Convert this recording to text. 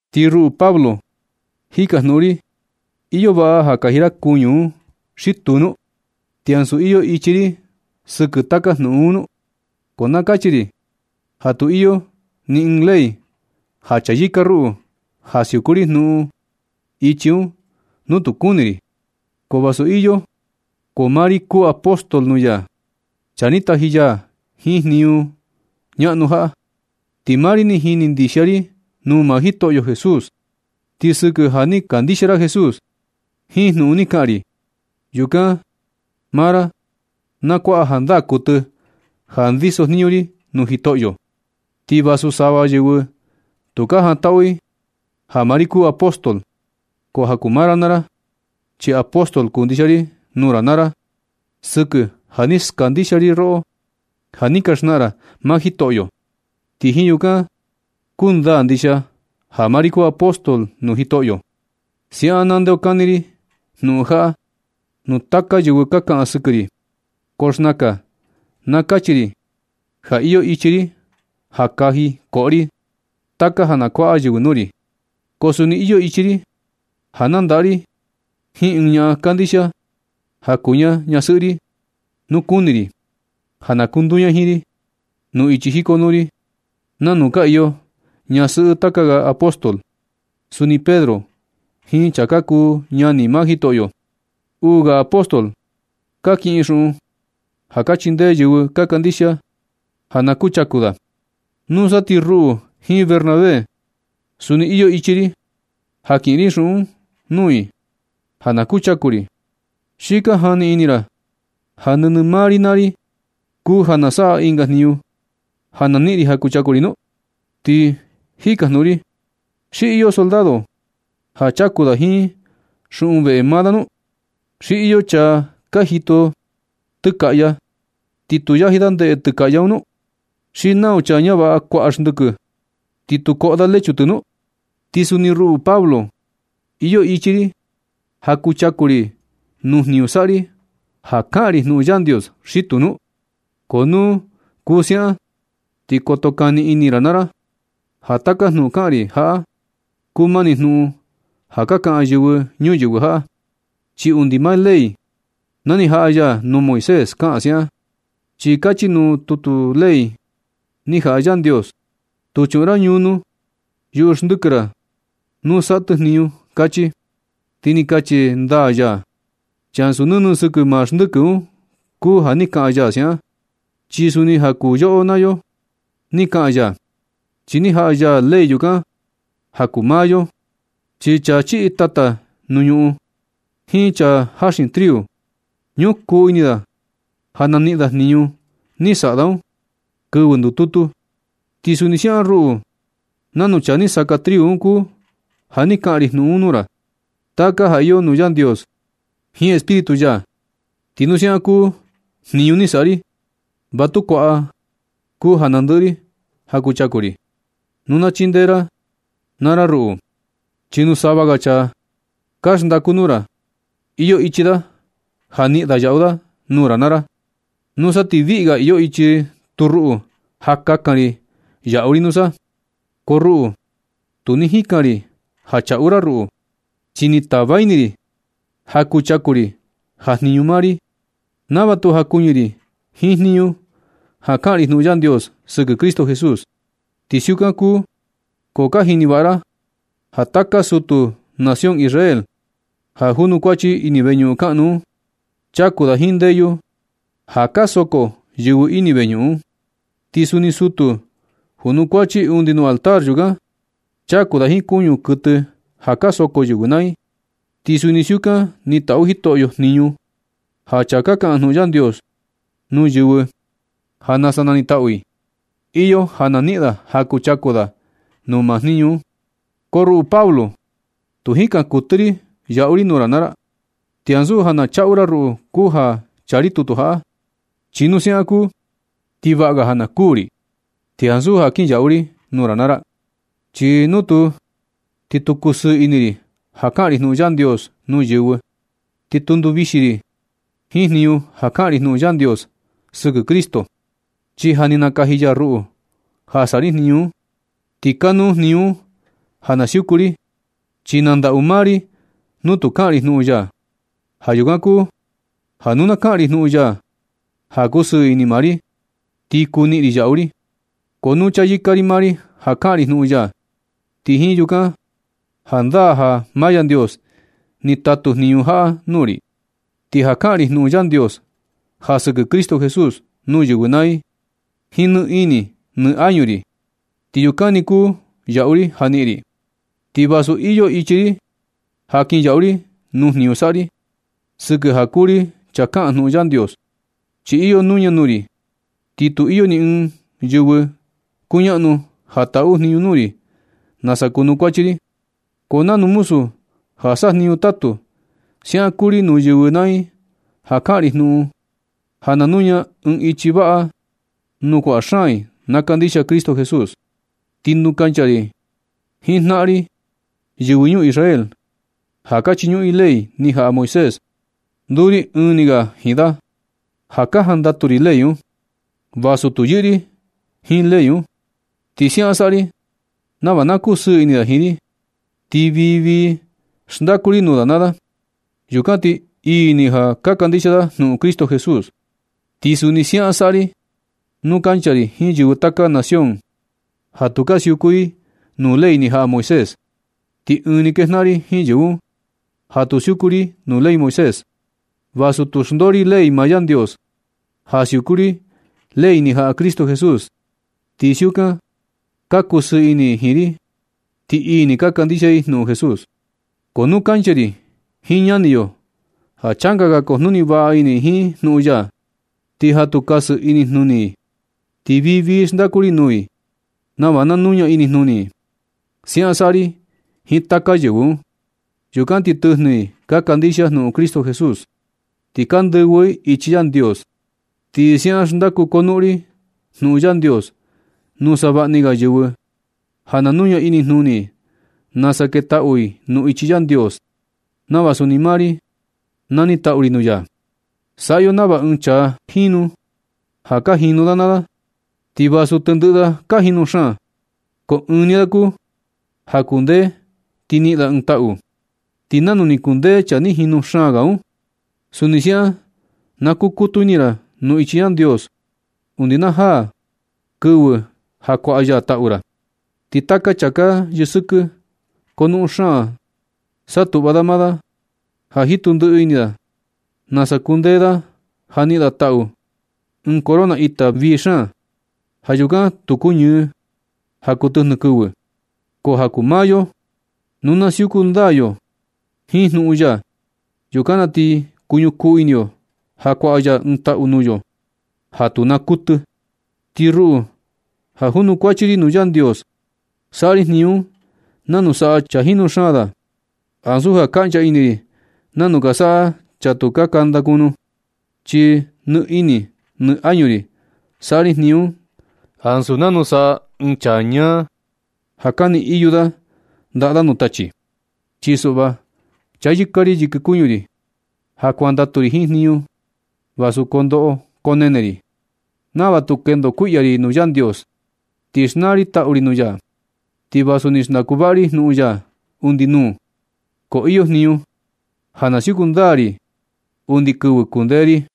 Ti ruꞌu Pablo jikajnuꞌun ri, ¿iyo vaꞌa ja kaji ri kuñu un xi tuu nu? ¿Ti ansu iyo ichi ri sɨkɨ taka jnuꞌun un nu? Ko na kachi ri ja tu iyo ni ɨɨn ley ja chayɨka ruꞌu ja siuku ri jnuꞌun ichi un nu tu kuni ri. Ko vasu iyo, ko maa ri kuu apóstol nuu ya, chaa ni taji ya jiin jniñu ñaꞌnu jaꞌa. Ti maa ri ni jini ndixia ri nuu maa Jitoꞌyo Jesús. Ti sɨkɨ ja ni ka kandixia ra Jesús jiin jnuꞌun ni kaꞌan ri, yukan maa ra na kuaꞌa jandaa kuɨtɨ ja ndiso jniñu ri nuu Jitoꞌyo. Ti vasu sava yɨvɨ tu ka jantaꞌu i ja maa ri kuu apóstol, ko ja kuu maa ra naa ra, chi apóstol kuu ndixia ri nuu ra naa ra sɨkɨ ja ni skandixia ri roꞌo ja ni ka xnaꞌan ra maa Jitoꞌyo. Ti jiin yukan kundaa ndixia ja maa ri kuu apóstol nuu Jitoꞌyo. Siaꞌan na ndeokani ri jnuꞌun jaꞌa nuu taka yɨvɨ ka kaꞌan sɨkɨ ri. Ko xnakan na kachi ri ja iyo ichi ri ja kaji koꞌo ri taka ja na kuaꞌa yɨvɨ nuu ri. Ko suni iyo ichi ri ja nandaꞌa ri jiin ɨɨn ñaꞌan kandixia ja kuu ña ñasɨꞌɨ ri nu kuni ri, ja na kunduu ña jiin ri nuu ichi jikonuu ri, nanu ka iyo ñasɨꞌɨ taka ga apóstol, suni Pedro jiin chaa ka kuu ñani maa Jitoꞌyo. Uu ga apóstol ka kiꞌin xuꞌun ja ka chindee yɨvɨ ka kandixia ja na kuchaku da. Nusa ti ruꞌu jiin Bernabé, suni iyo ichi ri ja kiꞌin ri xuꞌun nuu i ja na kuchaku ri. ¿Xi ka jani ini ra ja nɨnɨ maa ri naa ri kuu ja na saꞌa ɨnga jniñu ja na niꞌin ri ja kuchaku ri nu? Ti jikajnuꞌun ri, ¿xi iyo soldado ja chaku da jiin xuꞌun veꞌe maa da nu? ¿Xi iyo chaa ja jitu tɨkaꞌya ti tu yaji da ndeꞌe tɨkaꞌya un nu? ¿Xi nau chaa ñavaꞌa kuaꞌa xndɨkɨ, ti tu koꞌo da lechu tɨ nu? Ti suni ruꞌu Pablo, ¿Iyo ichi ri ja kuchaku ri nuu jniñu saꞌa ri ja kaꞌan ri jnuꞌun Yandios, xi tuu nu? Ko nu kuu siaꞌan ti koto kani ini ra naa ra ja taka jnuꞌun kaꞌan ri jaꞌa kuu mani jnuꞌun ja ka kaꞌan yɨvɨ ñuyɨvɨ jaꞌa. Chi undi maa ley ja ni jaꞌa ya nuu Moisés kaꞌan siaꞌan. Chi kachi nuu tutu ley ni jaꞌa Yandios: “Tu chuꞌun ra ñunu yuꞌu xndɨkɨ ra nu saꞌa tɨ jniñu”, kachi. Ti ni kachi ndaa ya, chi ansu nɨnɨ sɨkɨ maa xndɨkɨ un kuu ja ni kaꞌan ya siaꞌan. Chi suni ja kuu yoꞌo naa yo ni kaꞌan ya, chi ni jaꞌa ya ley yukan ja kuu maa yo. Chi chaa chiꞌi tata nuu ñuꞌun jiin chaa jaxin triu, ñukuu ini da ja na niꞌin da jniñu ni saꞌa da un kɨvɨ ndututu. Ti suni siaꞌan ruꞌu, nanu chaa ni saka triu un kuu ja ni kaꞌan ri jnuꞌun nuu ra, taka ja iyo nuu Yandios jiin Espíritu ya. Ti nu siaꞌan kuu jniñu ni saꞌa ri, va tu kuaꞌa kuu ja nandɨꞌɨ ri ja kuchaku ri, nu na chindee ra naa ra ruꞌu. Chi nu sava ga chaa ka xndaku nuu ra, iyo ichi da ja niꞌin da yaꞌu da nuu ra naa ra. Nusa ti viꞌi ga iyo ichi tu ruꞌu ja kakan ri yaꞌu ri nusa. Ko ruꞌu tu ni jikan ri ja chaꞌu ra ruꞌu, chi ni tava ini ri ja kuchaku ri ja jiñu maa ri, nava tu jakuɨñɨ ri jiin jniñu ja kaꞌan ri jnuꞌun Yandios sɨkɨ Cristo Jesús. Ti siukan kuu ko ka jini vaꞌa ra ja taka sutu nación Israel ja junukuachi ini veñuꞌun kaꞌnu un, chaku da jiin ndeyu ja ka soko yɨvɨ ini veñuꞌun un. Ti suni sutu junukuachi undi nuu altar yukan, chaku da jiin kuñu kuɨtɨ ja ka soko yɨvɨ naa i. Ti suni siukan ni taꞌu Jitoꞌyo, jniñu ja chaa ka kaꞌan jnuꞌun Yandios nuu yɨvɨ ja na sa nanitaꞌu i, iyo ja na niꞌin da ja kuchaku da nuu maa jniñu un. Ko ruꞌu Pablo, tu jikan kuɨtɨ ri yaꞌu ri nuu ra naa ra, ni ansu ja na chaꞌu ra ruꞌu kuu ja chaa ri tutu jaꞌa. Chi nu siaꞌan na kuu, ti vaꞌa ga ja na kuū ri, ti ansu ja kinyaꞌu ri nuu ra naa ra. Chi nu tuu, ti tu kusɨɨ ini ri ja kaꞌan ri jnuꞌun Yandios nuu yɨvɨ. Ti tu nduvixi ri jiin jniñu ja kaꞌan ri jnuꞌun Yandios sɨkɨ Cristo, chi ja ni nakaji ya ruꞌu ja saꞌa ri jniñu un. Ti kanuu jniñu un ja na siuku ri, chi na ndaꞌu maa ri nu tu kaꞌan ri jnuꞌun ya. Ja yukan kuu ja nu na kaꞌan ri jnuꞌun ya ja kusɨɨ ini maa ri, ti kuu niꞌin ri yaꞌu ri. Ko nu chayɨka ri maa ri ja kaꞌan ri jnuꞌun ya, ti jiin yukan jandaa ja maa Yandios ni tatu jniñu jaꞌa nuu ri. Ti ja kaꞌan ri jnuꞌun Yandios ja sɨkɨ Cristo Jesús nuu yɨvɨ naa i jiin ni ini ni añu ri, ti yukan ni kuu yaꞌu ri ja niꞌin ri, ti vasu iyo ichi ri ja kinyaꞌu ri nuu jniñu saꞌa ri, sɨkɨ ja kuu ri chaa kaꞌan jnuꞌun Yandios. Chi iyo nuña nuu ri, ti tu iyo ni ɨɨn yɨvɨ kuñaꞌnu ja taꞌu jniñu nuu ri nasa kunukuachi ri. Ko nanu muzu ja sajniñu tatu, siaꞌan kuu ri nuu yɨvɨ naa i ja kaꞌan ri jnuꞌun ja na nuña ɨɨn ichi vaꞌa nuu kuaꞌa xaan i na kandixia Cristo Jesús. Ti nu kancha ri jiin jnaꞌan ri, yɨvɨ ñuu Israel ja ka chiñuꞌun i ley ni jaꞌa Moisés, nduu ri ɨɨn ni ga jiin da ja ka jandatu ri ley un, vasu tu yɨꞌɨ ri jiin ley un. Ti siaꞌan saꞌa ri nava na kusɨɨ ini da jiin ri. Ti vii vii xndaku ri nuu da naa da. Yukan ti ii ni ja ka kandixia da jnuꞌun Cristo Jesús. Ti suni siaꞌan saꞌa ri nuu kancha ri jiin yɨvɨ taka ga nación ja tu ka siuku i nuu ley ni jaꞌa Moisés, ti ɨɨn nuu kejnaꞌan ri jiin yɨvɨ un ja tu siuku ri nuu ley Moisés, vasu tu xndoo ri ley maa Yandios, ja siuku ri ley ni jaꞌa Cristo Jesús. Ti siukan ka kusɨɨ ini i jiin ri, ti ii ni ka kandixia i jnuꞌun Jesús. Ko nu kancha ri jiin ñani yo ja changa ga kujnuni vaꞌa ini i jiin jnuꞌun ya, ti ja tu kasɨ ri inijnuni i, ti vii vii xndaku ri nuu i nava na nuña inijnuni i. Siaꞌan saꞌa ri jiin taka yɨvɨ un. Yukan ti tɨjnɨ i ka kandixia jnuꞌun Cristo Jesús ti ka ndɨvɨ i ichi Yandios. Ti siaꞌan xndaku konuꞌun ri jnuꞌun Yandios nuu savaꞌni ga yɨvɨ ja na nuña inijnuni i nasa ketaꞌu i nuu ichi Yandios, nava suni maa ri na nitaꞌu ri nuu ya. Saꞌa yo nava ɨɨn chaa jinu ja ka jinu da naa da. Ti vasu tendɨꞌɨ da ka jinu xaan, ko ɨɨn ni da kuu ja kundee ti niꞌin da ɨɨn taꞌu. Ti nanu ni kundee chaa ni jinu xaan ga un, suni siaꞌan na kukutu ini ra nuu ichi Yandios undi najaa kɨvɨ ja kuaꞌa ya taꞌu ra. Ti taka chaa ka yɨsɨkɨ, konuꞌun xaan satuꞌva da maa da ja jitu ndiꞌi ini da nasa kundee da ja niꞌin da taꞌu, ɨɨn corona ita vii xaan, ja yukan tu kuñɨɨ ja kuu tɨjnɨ kɨvɨ. Ko ja kuu maa yo, nu na siuku ndaa yo jiin jnuꞌun ya, yukan na ti kuñukuu ini yo ja kuaꞌa ya ɨɨn taꞌu nuu yo ja tu naa kuɨtɨ. Ti ruꞌu, ja junukuachi ri nuu Yandios, saꞌa ri jniñu un nanu saꞌa chaa jinu xaan da ansu ja kaꞌncha ini ri nanu ka saꞌa chaa tu ka kanda kunu. Chi nɨ ini nɨ añu ri saꞌa ri jniñu un ansu nanu saꞌa ɨɨn chaa ñaa ja kani iyu da ndaꞌa da nuu tachi. Chi suꞌva chayɨka ri yɨkɨ kuñu ri ja kuandatu ri jiin jniñu ri vasu koo ndoꞌo koo nene ri, nava tu kendo kuiꞌya ri nuu Yandios ti xnaa ri taꞌu ri nuu ya. Ti vasu ni xndaku vaꞌa ri jnuꞌun ya undi nuu, ko iyo jniñu ja na siuku ndaa ri undi kɨvɨ kundee ri.